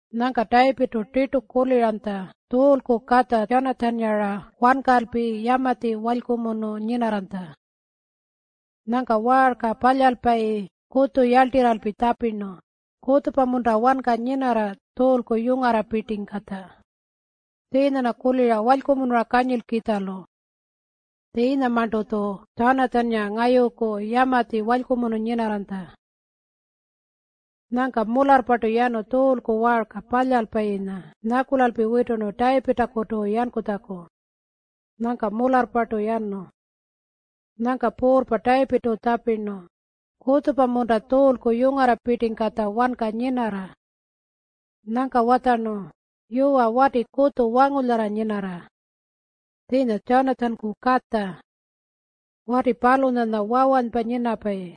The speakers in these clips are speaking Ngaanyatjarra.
Nyangka Tayipirrtu tirtu kuliranytja Tjuulku katja Tjanatjannga-ra wankalpi yamatji walykumunu nyinarranytja. Nyangka waarka palyalpayi kutju yarltirralpi tjapirnu, “Kutjupa-munta wanka nyinarra Tjuulku yungarrapirtingkatja? Tjiinya-rna kulira walykumunura kanyilkitjalu. Tjiinyamarntu-tju Tjanatjannga ngayuku yamatji walykumunu nyinarranytja.” Nyangka mularrpartu yanu Tjuulku waarka palyalpayinya nyakulalpi witurnu Tayipirrtakutu yankutjaku. Nyangka mularrpartu yanu. Nyangka puurrpa Tayipirrtu tjapirnu, “Kutjupa-munta Tjuulku yungarrapirtingkatja wanka nyinarra?” Nyangka watjarnu, “Yuwa, wati kutju wangulyara nyinarra. Tjiinya Tjanatjanku katja. Wati palunyanya wawanypa nyinapayi.”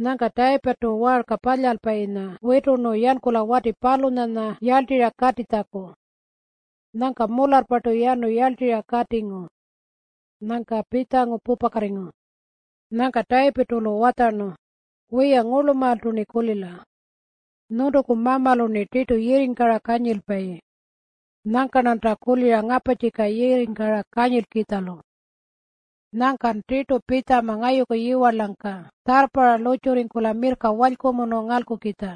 Nyangka Tayipirrtu waarka palyalpayinya witurnu yankula wati palunyanya yarltirra katitjaku. Nyangka mularrpartu yanu yarltirra katingu. Nyangka pitjangu pupakatingu. Nyangka Tayipirrtu-lu watjarnu, “Wiya, ngurlumaaltu-rni kulila. Nyuntuku mamalu-rni tirtu yirringkara kanyilpayi. Nyangka-rnanta kulira ngaparrtjika yirringkara kanyilkitjalu. Nyangkan tirtu pitjama ngayuku yiwarlangka tjarrparra lurrtjurringkula mirrka walykumunu ngalkukitja.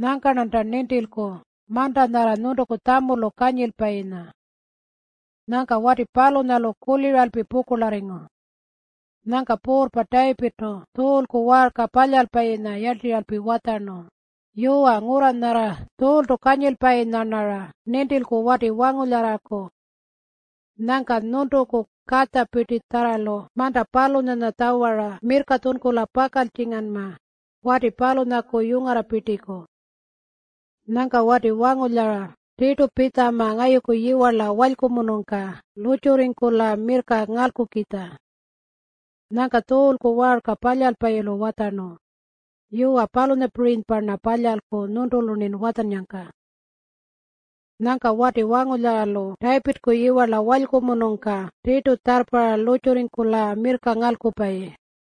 Nyangka-rnanku nintilku manta nyarra nyuntuku tjamulu kanyilpayinya.” Nyangka wati palunyalu kuliralpi pukurlarringu. Nyangka puurrpa Tayipirrtu Tjuulku waarka palyalpayinya yarltirralpi watjarnu, “Yuwa, ngurra nyarra Tjuultu kanyilpayinya-rnara nintilku wati wangulyaraku. Nyangkan nyuntuku katjapirtitjarralu manta palunyanya tjawara mirrka tjunkula pakaltjinganma wati palunyaku yungarrapirtiku. Nyangka wati wangulyara tirtu pitjama ngayuku yiwarla walykumunungka lurrtjurringkula mirrka ngalkukitja.” Nyangka Tjuulku waarka palyalpayilu watjarnu, “Yuwa, palunyapirinypa-rna palyalku nyuntulu-rnin watjannyangka.” Nyangka wati wangulyaralu Tayipirrku yiwarla walykumunungka tirtu tjarrparra lurrtjurringkula mirrka ngalkupayi.